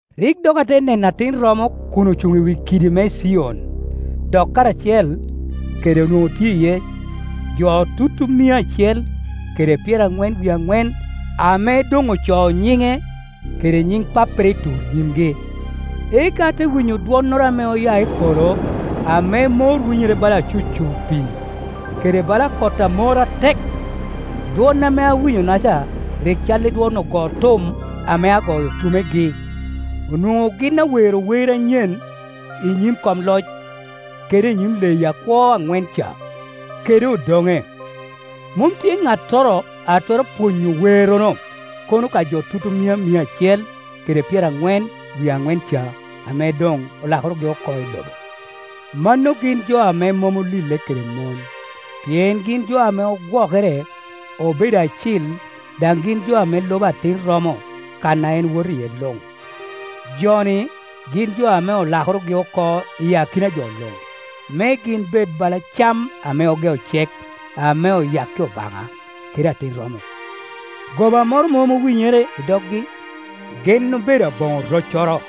Rik dok ate neno Atin romo kun ocuŋ i wi kidi me Cion, dok karacel kede onwoŋo tye jo tutumia mia acel kede pyeraŋwen wie aŋwen, ame doŋ ocoo nyiŋe kede nyiŋ Pappere i tur nyimgi. Eka ate winyo dwonnoro ame oya i polo ame mor winyere bala acucur pii, kede bala kot a mor atek. Dwon ame awinyo-naca rik cal i dwon ogo tum ame agoyo tumegi. Onwoŋo gin awero wer anyen i nyim kom loc, kede i nyim leyi akwo aŋwen ca, kede odoŋe. Mom tye ŋattoro a twero pwonyo werrono, kono ka jo tutumia mia acel kede pyeraŋwen wie aŋwen ca ame doŋ olakorogi oko i lobo. Mano gin jo ame mom olille kede mon, pien gin jo ame ogwokere obedo acil; daŋ gin jo ame lubo Atin romo kan a en woto iye luŋ. Jo-ni gin jo ame olakorogi oko i akina jo luŋ, me gin bed bala cam ame ogeo cek ame oyakki Obaŋa kede Atin romo. Goba moro mom owinyere doggi; gin obedo aboŋo roccoro.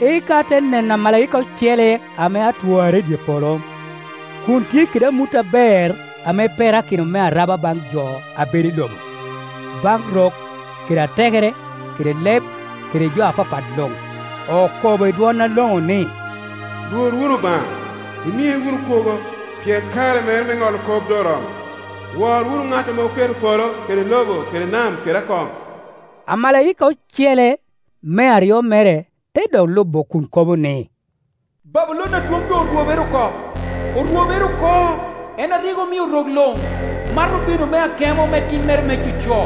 Eka ate neno amalaika ocele ame atwarre i dye polo, kun tye kede amut aber ame perakino me araba baŋ jo a bedo i lobo, baŋ rok kede atekere kede leb kede jo apapat luŋ. Okobo i dwon aloŋo ni, “Lwor wunu Obaŋa, imie wunu kwogo, pien kare mere me ŋolo kop doŋ oromo. Wor wunu ŋat ame oketo polo kede lobo kede nam kede akoŋ.” Amalaika ocele, me aryo mere, te dok lubo kun kobo ni, “Babulon adwoŋ orwobere oko, orwobere oko, en a rik omio rok luŋ mato vino me akemo me timmere me coco.”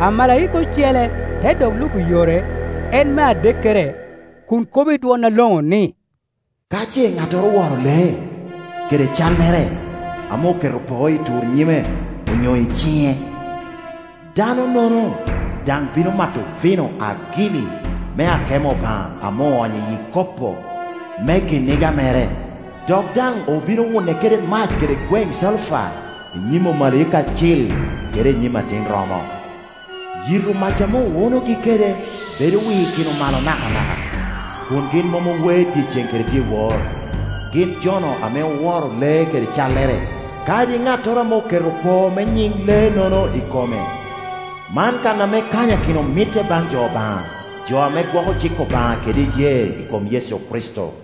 Amalaika ocele te dok lubo yore, en me adekkere, kun kobo i dwon aloŋo ni, “Ka ce ŋattoro oworo lee, kede callere, ame oketo poo i tur nyime onyo i ciŋe, danonono daŋ bino mato vino agili me akemo Obaŋa ame oonyo iyi ikopo me kiniga mere, dok daŋ obino wune kede mac kede gweŋ calufa i nyim omalaika acil kede i nyim Atin romo. Yito mac ame owunogi kede bedo wikino malo nakanaka, kun gin mom owe dyeceŋ kede iwor, gin jo-nu ame oworo lee kede callere, kadi ŋattoro ame oketo poo me nyiŋ lee-nono i kome.” Man kan ame kanyakino mitte i baŋ jo Obaŋa, jo ame gwoko cik Obaŋa kede iyee i kom Yecu Kricito.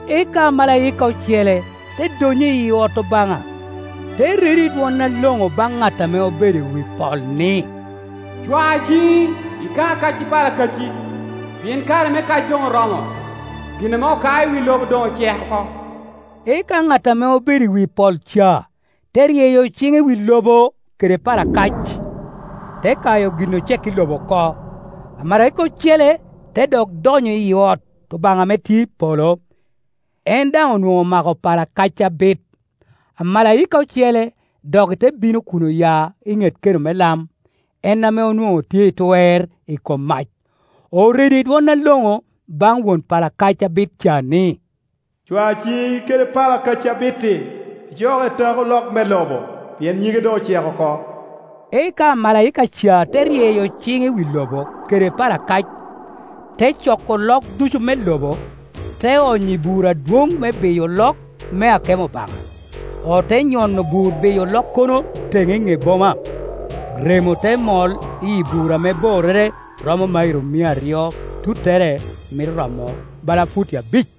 Eka amalaika ocele te donnyo iyi ot Obaŋa, te redo i dwon aloŋo baŋ ŋat ame obedo i wi pol ni, “Cwa ciŋi, ika kac i pala kacci, pien kare me kac doŋ oromo, gin ame okao i wi lobo doŋ ocek oko.” Eka ŋat ame obedo i wi pol ca te ryeyo ciŋe i wi lobo kede pala kac, te kayo gin ocek i lobo oko. Amalaika ocele te dok donnyo iyi ot Obaŋa ame tye i polo, en daŋ onwoŋo omako pala kac abit. Amalaika ocele doki te bino kun oya i ŋet keno me lam, en ame onwoŋo tye i twer i kom mac. Oredo i dwon aloŋo baŋ won pala kac abit ca ni, “Cwa ciŋi kede pala kacci abit-ti, icok etak olok me lobo, pien nyige doŋ ocek oko.” Eka amalaika ca te ryeyo ciŋe i wi lobo kede pala kac, te coko olok ducu me lobo, te onyo i bur adwoŋ me biyo olok me akemo Obaŋa. Ote nyono bur biyo olokkono teŋe i ŋe boma, remo te mol iyi bur ame borrere romo mairo mia aryo, tuttere mito romo bala futi abic.